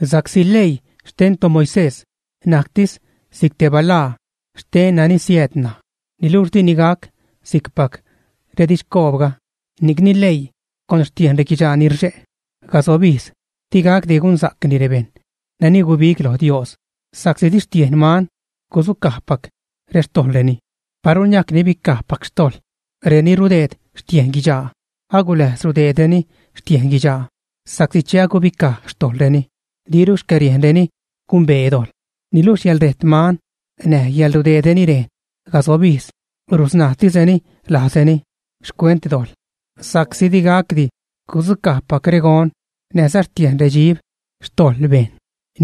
Sa'csi leii xten toMoisés najctis si'c te balaa xten nani siääd ṉaj. Niluxh dini gac si'cpac redidxcoobga. Ni'cni leii, con xtiejn reguidxaa ni rxe' cazob ijz digacdi gunsa'cni rebejṉ nani guibig lo Dios, sa'csi di xtiejn man gudzucajpac rextojḻreni. Paru niajc nibicajpac xtojḻ reni rudeed xtiejn guidxaa, aguläjz rudeedreni xtiejn guidxaa, sa'csi che gubicaj xtojḻreni, diru xcäriejnreni gumbee dojḻ. Niluxh yäḻrejt man näj yäḻrudeedreni rejn casob ijz rusnajtisreni lajzreni xcuent dojḻ. Sa'csi digacdi gudzucajpac regon näjza xtiejn redxib xtojḻ bejṉ.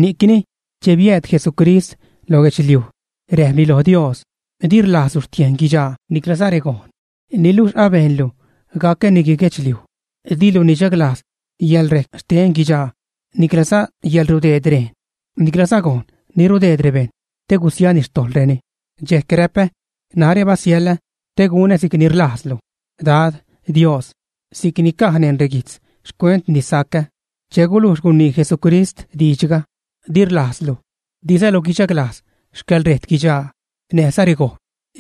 Ni'cni che biääd Jesucrist lo guedxliuj räjpni lo Dios: Di rlajzlu xtiejn guidxaa niclaza regon niluxh abejnlu gacä nigui-guedxliuj. Dilu nichaglajz yäḻrejc xten guidxaa niclaza yäḻrudeed rejn, niclaza gojn ni rudeed rebejṉ te gusiani xtojḻreni. Dxejc räpä: “Narä basiälä te gunä si'cni rlajzlu Dad, Dios, (si'cni caj neṉ reguijtz xcuent ni sacä).” Che gulujx gunii Jesucrist diidxga: “Di rlajzlu, dizalu guidxaglajz xcäḻrejt guidxaa näjza regon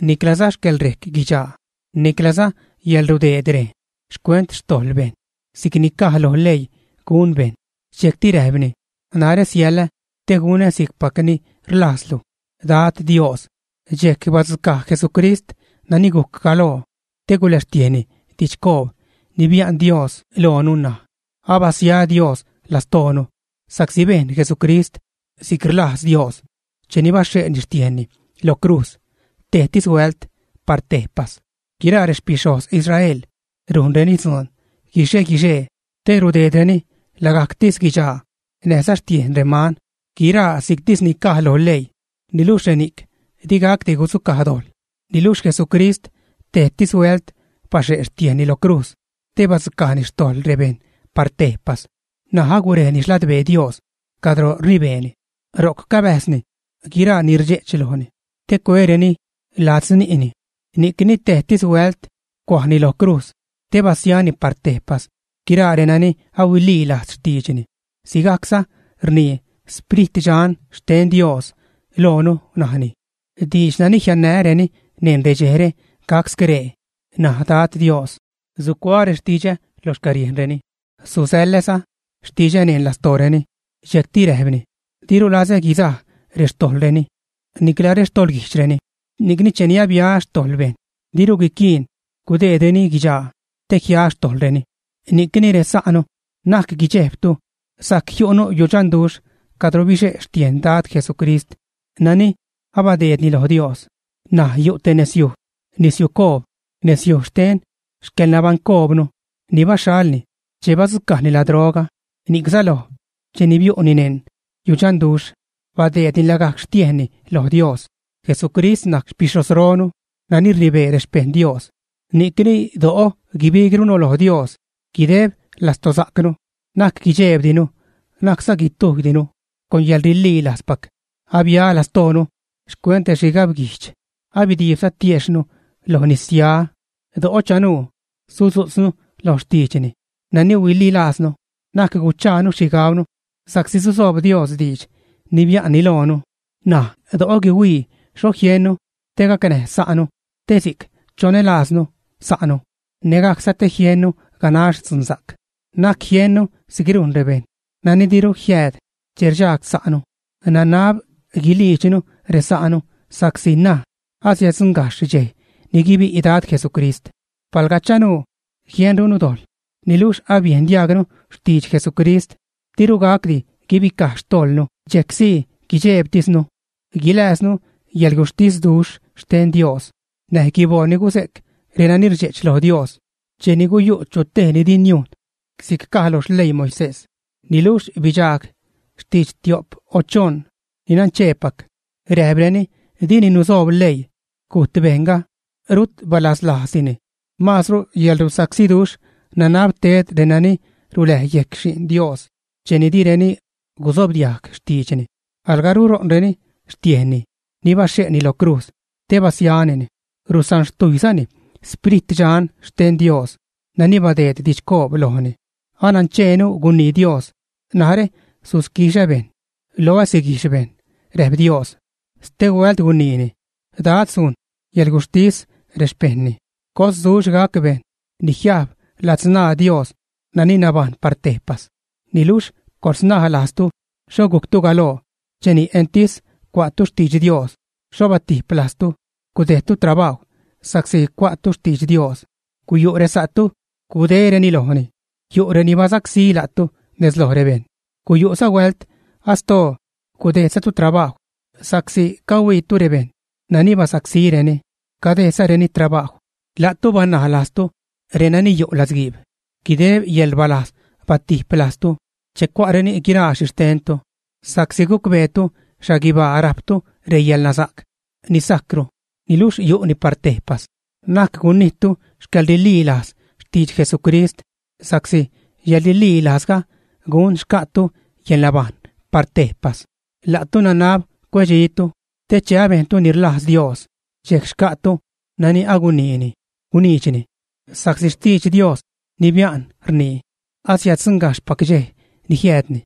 niclaza xcäḻrejc guidxaa, niclaza yäḻrudeed rejn xcuent xtojḻ bejṉ si'cni caj lo leii gun bejṉ.” Dxejcti räjpni: “Narä siälä, te gunä si'cpac ni rlajzlu, Dad Dios.” Dxejc badzucaj Jesucrist nani gujc galoo, te guläxtiejni didxcoob ni bia'n Dios loonu ṉaj. Abasia Dios lastoonu sa'csi bejn Jesucrist si'c rlajz Dios cheni baxhe'ni xtiejnni lo crujz tejtis huält par tejpas. Guiraa rexpixhojz Israel rujnreni dzuun guixe-guixee te rudeedreni lagajctis guidxaa, näjza xtiejn reman, guiraa si'ctis ni caj lo leii, niluxh reni'c digacdi gudzucaj dojḻ. Niluxh Jesucrist tejtis huält baxhe' xtiejnni lo crujz te badzucajni xtojḻ rebejṉ par tejpas. N̲aj agurejni xladbee Dios cadro rnibeeni. Ro'c cabäjzni guiraa ni rdxe'ch lojni te cuereni ladzni'ni. Ni'cni tejtis huält cuajni lo crujz te basiani par tejpas guiraa renani ahuililajz xtiidxni. Sigajcza rnii Sprit Dxan xten Dios loonu; najni: Diidx nani jiannää́reni neṉ redxejre gac scree, naj Dad Dios: sucuaä rextidxä lo xcäriejnreni, susäḻäza xtidxä neṉ lastooreni. Dxejcti räjpni: Diru lazä guizaj rextojḻreni nicla rextoḻguijdxreni. Ni'cni, cheni abia xtojḻ bejṉ, diru quiquiin gudeedreni guidxaa te jia rextojḻreni. Ni'cni resa'nu, na'c guidxejbtu, sajc jiu'nu yudxanduxh cadro bixe' xtiejn Dad Jesucrist nani abadeedni lo Dios. N̲aj yu' te nezyuj, nezsiucoob, nezyuj xten xcäḻnabaṉcoobnu ni baxhalni che badzucajni ladroga. Ni'c säloj cheni biu'ni neṉ yudxanduxh, badeedni lagajc xtiejnni lo Dios. Jesucrist najc xpixhojzronu nani rnibee rexpejṉ Dios. Ni'cni do'o guibigrunu lo Dios guideb lastosa'cnu, na'c guidxejbdinu, na'cza guitujydinu. Con yäḻrililajzpac abia lastoonu xcuent rexhigabguijdx, abidiibza tiejxhnu lo nis-ya. Do'o chanuu sudzu'tznu lo xtiidxni nani huililajznu, na'c guchaanu xhigabnu sa'csi susoob Dios diidx ni bia'nni loonu. N̲aj do'o guihuii xho jiennu te gacnäj sa'nu te si'c chonälajznu sa'nu nägajcza te jiennu ganax dzunsa'c. Na'c jiennu si'c rujn rebejṉ nani diru jiääd che rdxagsa'nu. Nanab guiliidxnu resa'nu sa'csi ṉaj asiäddzuṉgajxh dxej ni guibi' Dad Jesucrist. Palga chanuu jienrunu dojḻ, niluxh abiejn diajgnu xtidx Jesucrist, diru gacdi guibicaj xtojḻnu dxejc. Dxejcsii guidxeebtisnu guilääznu yäḻguxhtisduxh xten Dios näj guiboo ni guze'c renani rdxe'ch loj Dios. Cheni guyu' chu tej ni di niujn si'c caj lo xleii Moisés, niluxh bidxaag xtidx tio'p o choṉ ni nancheepac, räjpreni dini nusoob leii, gujt bejṉga, rut balaslajzdini. Maazru yäḻrusacsíduxh nanab ted renani ruläj yejc Xi'n Dios cheni direni gusobdiajg xtiidxni. Alga ruṟo'nreni xtiejnni ni baxhe'ni lo crujz te basianini. Rusanxtujyzani Sprit Dxan xten Dios nani badeed didxcoob lojni. Anancheenu gunii Dios: “Narä susquixä bejṉ; loä siguijx bejṉ”, räjp Dios. Stehuält guniini: “Dad sujn yäḻguxhtis rexpejṉni.” ¡Cosduxh gac bejṉ ni jiajb ladzṉaa Dios nani nabajṉ par tejpas! Niluxh coḻsnaj lajztu xho gujctu galoo; cheni entis cua'tu xtidx Dios, xho batip lajztu, gudejdtu trabajw sa'csi cua'tu xtidx Dios. Guyu' resa'tu gudéreni lojni, yu' reni basacsí la'tu nez loj rebejṉ. Guyu'za huält astoo gudejdzatu trabajw sa'csi cahuiitu rebejṉ nani basacsíreni, cadejdzareni trabajw. La'tu banaj lajztu renani yu' latzguiib, guideb yäḻrbalajz batip lajztu che cua'reni guiraa xhixtentu, sa'csi gucbeetu xhaguibaa rajptu reyäḻnasa'c ni sajcru, niluxh yu'ni par tejpas. Na'c gunijttu xcäḻrililajz xtidx Jesucrist, sa'csi yäḻrililajzga gun xca'tu yäḻnabajṉ par tejpas. La'tu nanab cuedxitu te che abejntu ni rlajz Dios, dxejc xca'tu nani aguniini guniidxni. Sa'csi xtidx Dios ni bia'n rnii: Asiäddzuṉgajxhpac dxej ni jiäädni,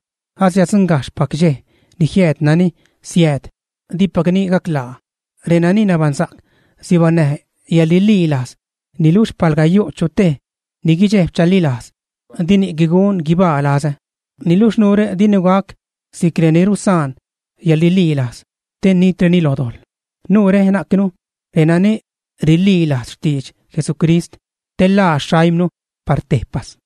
asiäddzuṉgajxhpac dxej ni jiääd nani siääd, dipacni gaclaa. Renani nabaṉsa'c sibaṉnäj yäḻrililajz, niluxh palga yu' chutej ni guidxejb chalilajz, dini'c gun guibaa lazä. Niluxh nuure dinu gac si'c reni rusaan yäḻrililajz te nitreni loj dojḻ. Nuure najcnu renani rililajz xtidx Jesucrist te ḻaa xaimnu par tejpas.